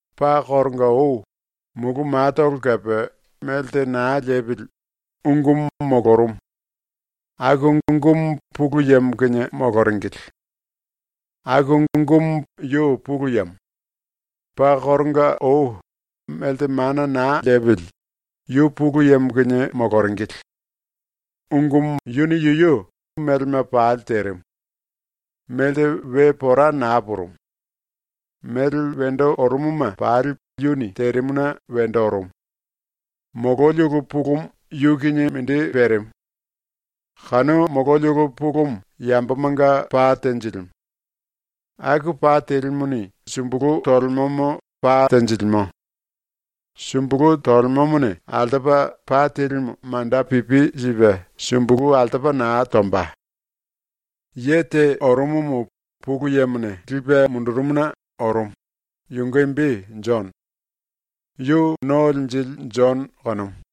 Paa koronga ou, ⸤mulu matolo kepe melte naa lepili,⸥ Ungumu molorumu. Aku Ungumu Pulu Yemo kinie moloringili. Aku Ungumu yu Pulu Yemo. Paa koronga ou, melte mana naa lepili, yu Pulu Yemo kinie moloringili. Ungumu yuni yuyu melema pali terimu. Melte we pora naa purumu. Mele wendo orumuma pali yuni terimuna wendo orumu. Mololi ulu pulumu yu kinie mindi perimu. Kanu mololi ulu pulumu yambomanga pa tenjilimu. Aku pa telimuni sumbulu tolemomo pa tenjilimo. Sumbulu tolemomone altopa pa telimu manda pipi sipe sumbulu altopa naa tomba. Ye te orumumu Pulu Yemone lipe mundurumuna orumu, yunge imbi Jono. ⸤Yu No Linjili Jono kanumu.⸥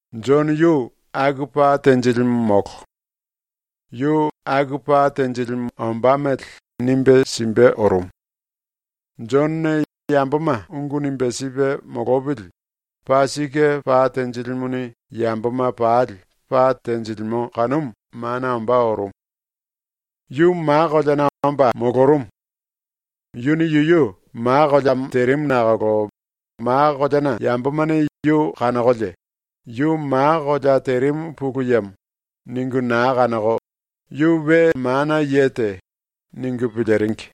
Jono yu aku pa tenjilimu molo. Yu aku pa tenjilimu ombá mele nimbe simbe orumu. Jonone yamboma ungu nimbe sipe molopili paa sike pa tenjilimuni yamboma pali pa tenjilimo kanumu mana ombá orumu. Yu ma koleana omba molorumu. Yuni yuyu ma koleamo terimu nakolo ma koleana yambomane yu kanokolie ‘Yu ma kolea terimu Pulu Yemo.’ ningu naa kanoko ‘Yu we mana ye te.’ ningu piliringi.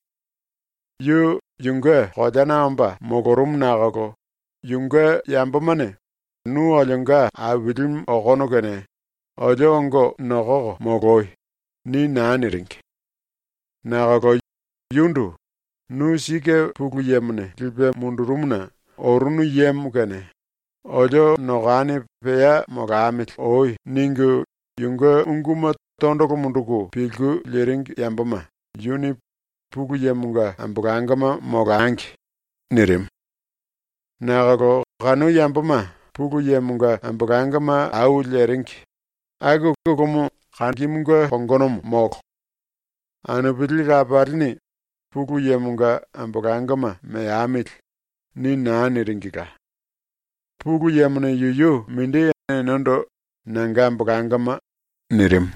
Yu yunge koleana omba molorumu nakolo yunge yambomane “Nu olionga Ailimu okono kene olio ongo nokoko moloi.” ni naa niringi. Nakolo yundu “Nu sike ⸤Pulu Yemone lipe mundurumuna orunu yemo kene⸥ olio nokani pea molamili oi.” ningu yunge unguma tondolo munduku pilku liringi yamboma yuni “Pulu Yemonga ambolangoma molangi.” nirimu. Nakolo kanu yamboma Pulu Yemonga ambolangoma au leringi, aku ulumu kangimunge kongonomo molo. Anupili lapalini “Pulu Yemonga ambolangoma meamili.” ni naa niringila. Pulu Yemone yuyu mindi enendo “Nanga ambolangoma.” nirimu.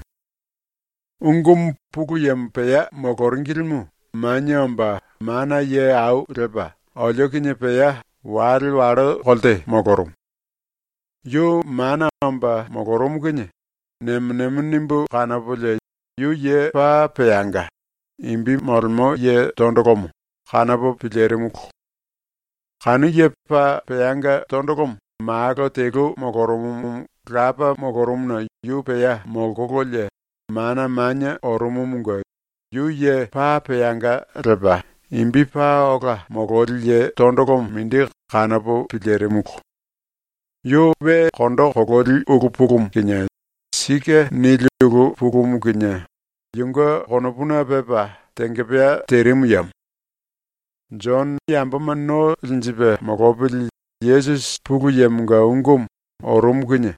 Ungumu ⸤Pulu Yemo pea moloringilimu⸥ manie omba mana ye au lepa olio kinie pea wale wallo kolte molorumu. Yu mana omba molorumu kinie nemo nemo nimbu kanopolie, yu ye paa peanga, imbi molemo ye tondolomo, kanopo pilirimulu. Kanu ye paa peanga tondolomo Malo telu molorumumu Lapa molorumuna yu pea molkololie mana manie orumumunge yu ye paa peanga lepa imbi paa ola mololi ye tondolomo mindi kanopo pilirimulu. Yu kondo kololi ulu pulumu kinie sike nili ulu pulumu kinie yunge konopuna pepa tengepea terimu yemo. ⸤Jono yamboma no linjipe molopili Yesusi Pulu Yemonga Ungumu orumu kinie⸥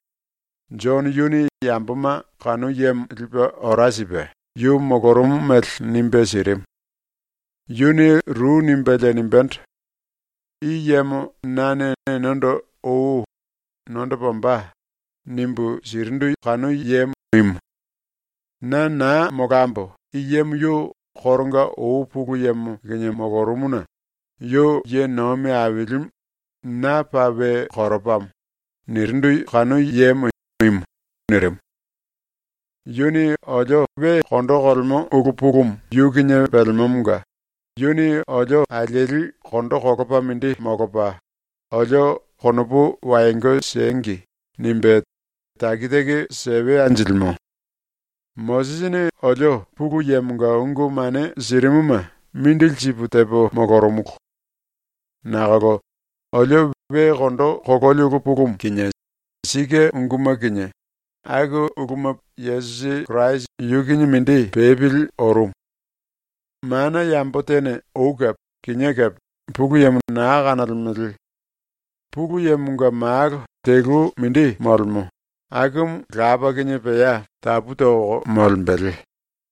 Jono yuni yamboma kanu yemo lipe ora sipe yu molorumu mele nimbe sirimu. Yuni ru nimbelie nimbendo: “I yemo nane enendo ou “Nondopa ombá.” nimbu sirindu kanu yemo imu. Na naa molambo i yemo yu koronga ou Pulu Yemo kinie molorumuna “Yu ye nomi ailimu na paa we koropamo.” nirindu kanu yemo imu.” nirimu. Yuni olio we kondo kolemo ulu pulumu yu kinie pelemomonga yuni olio alieli kondo kolopa mindi molopa olio ‘Konopu wayongo siengi.’ nimbe taki taki sewe anjilimo. Mosisini olio Pulu Yemonga ungu mane sirimuma mindili sipu tepo molorumulu. Nakolo olio we kondo kololi ulu pulumu kinie sike unguma kinie aku uluma Yesusi Kirasi yu kinie mindi pepili orumu. Mana yambo tene ou kepe, kinié kepe, Pulu Yemo naa kanolemele. Pulu Yemonga Malo telu mindi molemo, akumu Lapa kinie pea tapu toko molembele,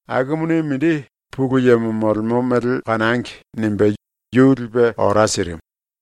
akumuni mindi ‘Pulu Yemo molemo mele kanangi.’ nimbe yu lipe ora sirimu.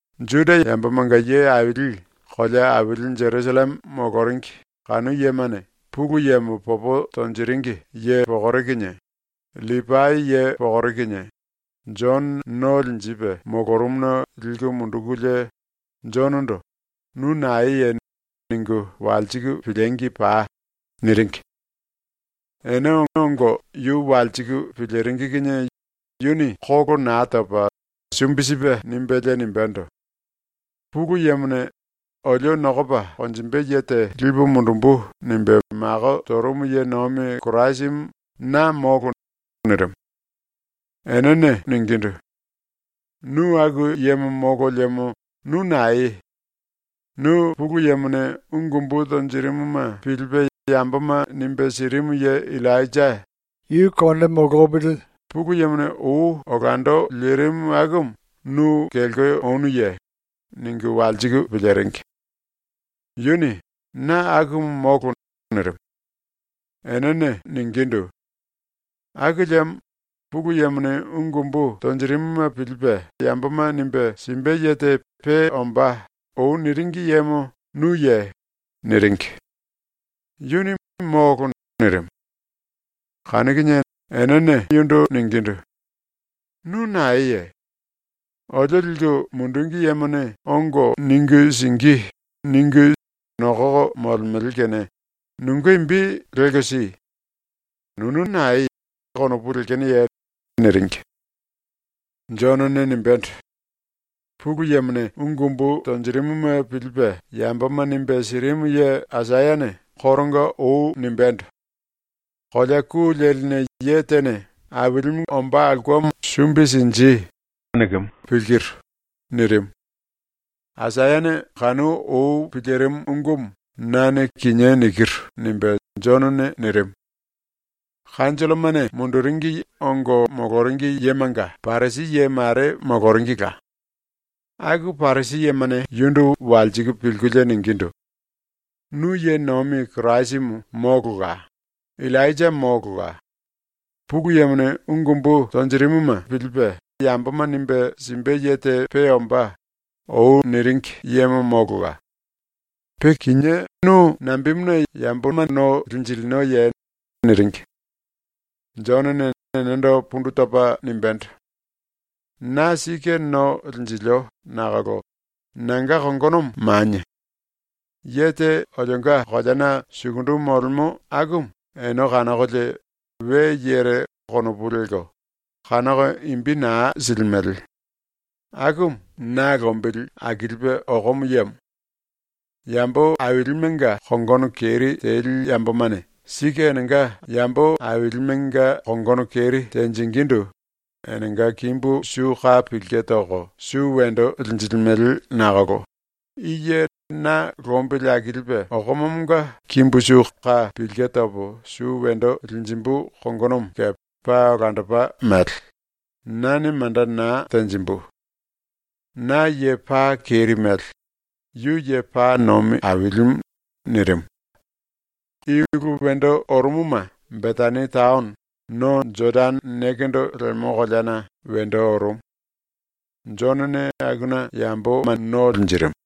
Juda yamboma⸤nga ye aili⸥ kolea aili Jerusalleme moloringi ⸤kanu yemane⸥ Pulu Yemo popo tonjiringi ye pokore kinie, LLipai ye pokore kinie Jono no linjipe molorumuna liku mundukulie, “Jonondo “Nu naeye?” ningu walsiku piliengi pai.” niringi. Ene ongo yu walsiku piliringi kinie yuni kolo naa topa sumbi sipe nimbelie nimbendo: “Pulu Yemone ‘Olio nokopa konjimbe ye te lipu mundumbu.’ nimbe mako torumu ye nomi Kirasimu na molo.” nirimu. Enene “Nu aku yemo molo liemo nu naeye? Nu Pulu Yemone ungu umbu tonjirimuma pilipe yamboma nimbe sirimu ye Illainja, ⸤Pulu Yemone ou olando lirimu akumu⸥ nu kelko onuye?” ningu walsiku piliringi. Yuni “Na akumu molo.” nirimu. Enene ningindu: “Aku liemo ‘Pulu Yemone ungu umbu tonjirimuma pilipe yamboma nimbe simbe ye te pe ombá.’ ⸤ou niringi yemo⸥ nuye?”. niringi. Yuni “Molo!” nirimu. Kanu kinie enene yundu ningindu: “Nu naeye? Olio liku mundungi yemane ‘Ongo ningu singí.’ ningu nokoko molemele kene nunge imbi lelko si. Nunu nae konopu lekenoye?” niringi. Jonone nimbendo: “Pulu Yemone ungu umbu tonjirimuma pilipe yamboma nimbe sirimu ye Aisayane koronga ou nimbendo: “Kolea ku leline ye tene “Ailimunge ombá aulkemo sumbi sinji.” nikimu pilkiru.” nirimu. Aisayane kanu ou pilirimu ungumu nane kinié nikiru.” nimbe Jonone nirimu. ⸤Kanjollomane⸥ munduringi ongo moloringi yemanga Parisi ye mare moloringila. Aku Parisi yemane yundu walsiku pilkulie ningindu: “Nu ye nomi Kirasimu molola, Illainja molola, ‘Pulu Yemone ungu umbu tonjirimuma pilipe yamboma nimbe simbe ye te pe ombá.’ ou niringi yemo molola. Pe kinié nu nambemuna yambo no linjilinoye?” niringi. Jonone enendo pundu topa nimbendo: “Na sike no linjilio nakolo nanga kongonomo manie. Ye te olionga koleana sukundu molemo akumu ene kanokolie ‘we yere’ konopu lelko, kanoko imbi naa silimele, akumu na lombili akilipe okomo yemo. ⸤Yambo ailimenga kongono keri teli yambomane sike enenga ailimenga kongono keri tenjingindu enenga kimbu su ka pilke toko su wendo linjilimele nakolo⸥ i ye na lombili akilipe okomomonga kimbu su ka pilke topo su wendo linjimbu kongonomo kepe paa olandopa mele, nane manda naa tenjimbu. Na ye paa keri mele; yu ye paa nomi ailimu.” nirimu. I ulu wendo orumuma Betani taono, no Jodane nekendo lemo koleana, wendo orumu. Jonone akuna yambo no linjirimu.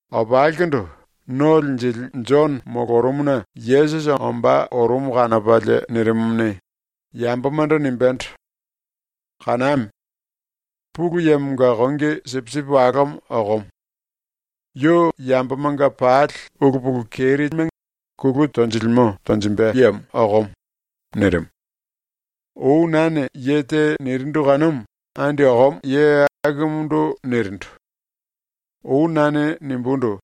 Opalikundu ⸤No Linjili⸥ Jono molorumuna Yesusi ombá orumu kanopalie nirimumuni, yambomando nimbendo: “Kaname! Pulu Yemonga Kongi Sipisipi Walomo okomo. Yu yambomanga pali ulu pulu keri teringi telemelema kulu tonjilimo tonjimbe yemo okomo.” ⸤nirimu⸥. “Ou nane ye te nirindu kanumu andi okomo ye akumundu nirindu. Ou nane nimbundu: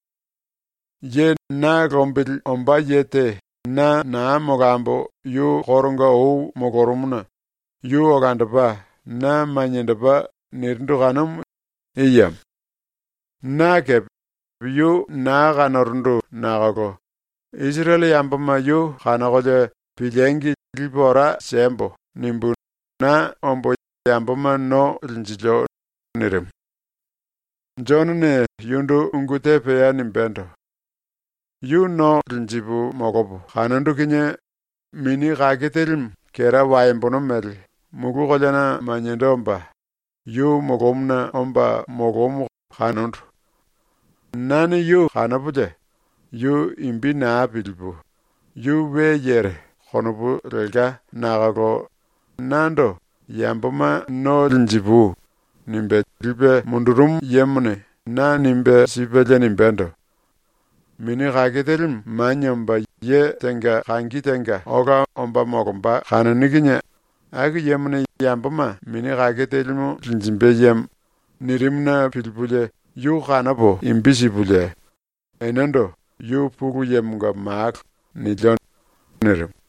“Ye na lombili ombá ye te na naa molambo yu koronga ou molorumuna yu olandopa na maniendopa.” nirindu kanumu i yemo. Na kepe yu naa kanorundu nakolo ‘Isirele yamboma yu kanokolie piliengi lipu ora siembo.’ nimbu na ombo yamboma no linjilio.” nirimu. Jonone yundu ungu te pea nimbendo: “Yu no linjipu molopo kanondu kinie Mini ⸤Kake Telimu⸥ kera waembono mele mulu koleana maniendo omba yu molomuna omba molomu kanondu. Nane yu kanopolie yu imbi naa pilipu ‘Yu we yere.’ konopu lelka nakolo nando “Yamboma no linjipui.” nimbe lipe mundurumu yemone na nimbe sipelie nimbendo: “Mini ⸤Kake Telimu⸥ manie omba ye tenga kangi tenga ola omba molomba kanoni kinie aku yemone yamboma Mini ⸤Kake Telimu⸥ linjimbe yemo.” nirimuna pilipulie yu kanopo imbi sipulie enendo “Yu Pulu Yemonga Malo.” nilio.” nirimu.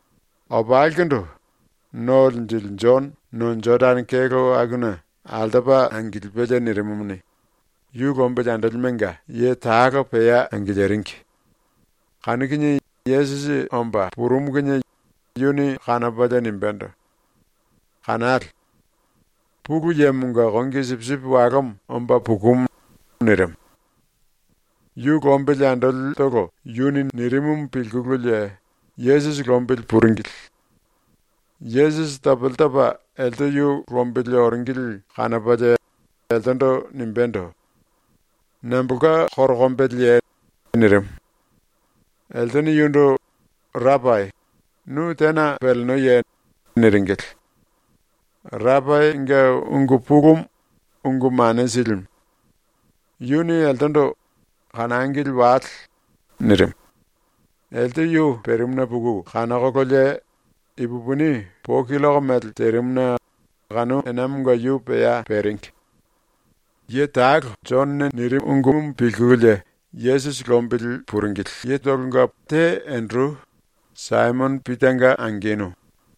Opalikundu ⸤No Linjili⸥ Jono no Jodane kelo akuna altopa angilipelie nirimumuni, yu lombili andolimenga ye talo pea angiliringi. Kanu kinie Yesusi omba purumu kinie yuni kanopalie nimbendo: “Kanale! Pulu Yemonga Kongi Sipisipi Walomo omba pukumu.” nirimu. Yu lombili andolitolo yuni nirimumu pilkululie Yesusi lombili puringili. Yesusi topele topa elte yu lombili oringili kanopalie eltendo nimbendo: “Nambolka korokombeleye?” nirimu. Eltene yundu “Rapai, nu tena pelenoye?” niringili. (Rapainge ungu pulumu ‘Ungu Mane Silimu’.) Yuni eltendo “Kanangili wale.” nirimu. Elte yu perimuna puku kanokololie ipupini po killoko mele terimuna kanu enamonga yu pea peringi. Ye talo Jonone nirimumu pilkululie Yesusi lombili puringili yetolonga te Enderu, Saimono Pitanga angenu.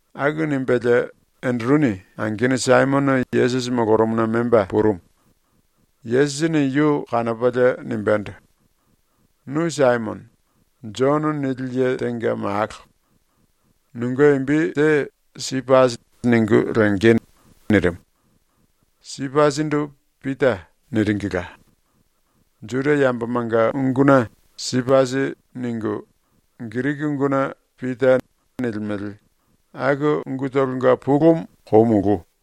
Aku nimbelie Enderuni angenu Saimono Yesusi molorumuna memba purumu. Yesusini yu kanopalie nimbendo: “Nu Saimono, ‘Jono’ nili ye tenga malo. Nunge imbi te ‘Sipasi’ ningu lenge.” nirimu. (Sipasindu ‘Pita’ niringila. Juda yambomanga unguna ‘Sipasi’ ningu, Giriki unguna ‘Pita’ nilimele, aku ungutolonga pulumu ‘kou mulu’.)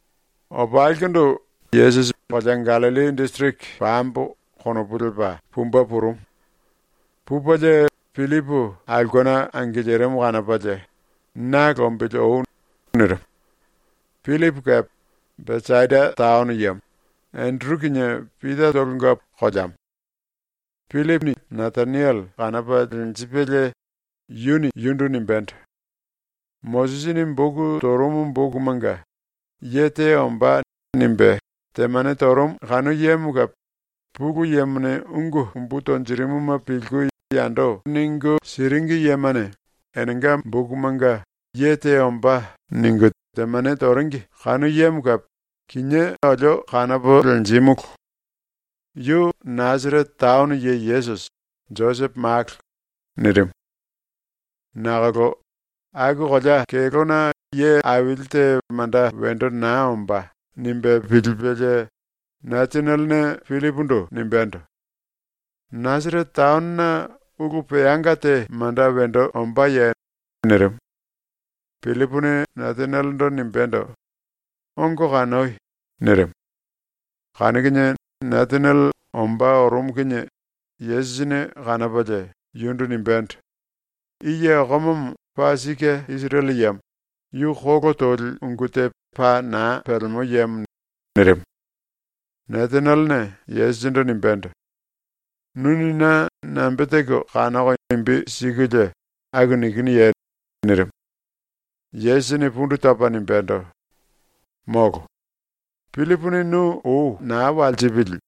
Opalikundu Yesusi ‘Kolea Gallilli disiriki pambo.’ konopu lepa pumbe purumu. Pupelie Pillipu aulkena angilirimu kanopalie, “Na lombili oi.” nirimu. Pillipu kepe Besaida taono yemo, Enderu kinie Pitatolonga koleamo. Pillipu Nataniele kanopa lenjipelie yuni yundu nimbendo: “Mosisini boku torumu bokumanga ‘Ye te ombá.’ nimbe temane torumu kanu yemo kepe, Pulu Yemone ungu umbu tonjirimuma pilku yando ningu siringi yemane enenga bokumanga ‘Ye te ombá.’ ningu temane toringi kanu yemo kepe, kinié olio kanopo lenjímulu. Yu Nasarete taono ye Yesusi, Josepo malo.” nirimu. Nakolo ‘Aku kolea kelóna ye aili te manda wendo naa ombá.’ nimbe pilipelie Natanielene Pillipundu nimbendo: “Nasarete taonona ulu peanga te manda wendo ombáye?” nirimu. Pillipuni Natanielendo nimbendo: “Ongo kanoi.” nirimu. Kanu kinie Nataniele ombá orumu kinie Yesusini kanopalie, yundu nimbendo: “I ye okomomo paa sike Isirele yemo, yu kolo toli ungu te paa naa pelemo yemo.” nirimu. Natanielene Yesusindu nimbendo: “Nuni na nambe teko kanoko imbi sikulie aku nikinuye?” nirimu. Yesusini pundu topa nimbendo: “Molo. Pillipuni nu ou naa walsipili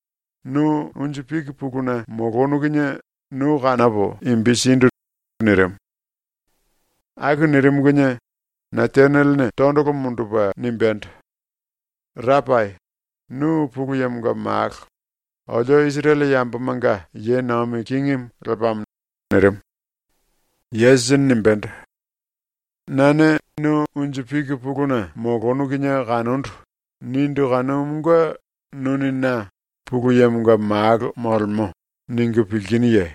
nu unju piki puluna molonu kinie nu kanopo imbi sindu.” nirimu. Aku nirimu kinie Natanielene tondolo mundupe nimbendo: “Rapai, nu Pulu Yemonga Malo, olio Isirele yambomanga ye nomi kingimu lepamo.” nirimu. Yesusini nimbendo: “Nane ‘Nu unju piki puluna molonu kinie kanondu.’ nindu kanumunge nuni na ‘Pulu Yemonga Malo molemo.’ ningu pilkinuye?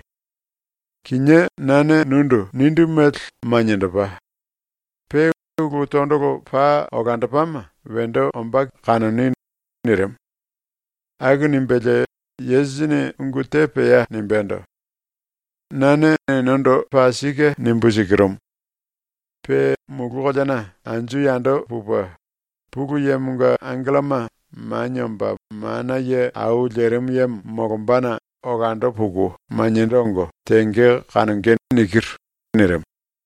Kinié nane nundu nindu mele maniendopa. Pe ulu tondolo paa olandopama wendo ombá kanoni.” nirimu. Aku nimbelie Yesusini ungu te pea nimbendo: “Nane enendo paa sike nimbu sikirumu: Pe mulu koleana anju yando pupe, Pulu Yemonga angelloma Manie Omba Mana Ye Au Lerimu Yemo molombana olando puku maniendo ongo tenge kanonge.” nirimu.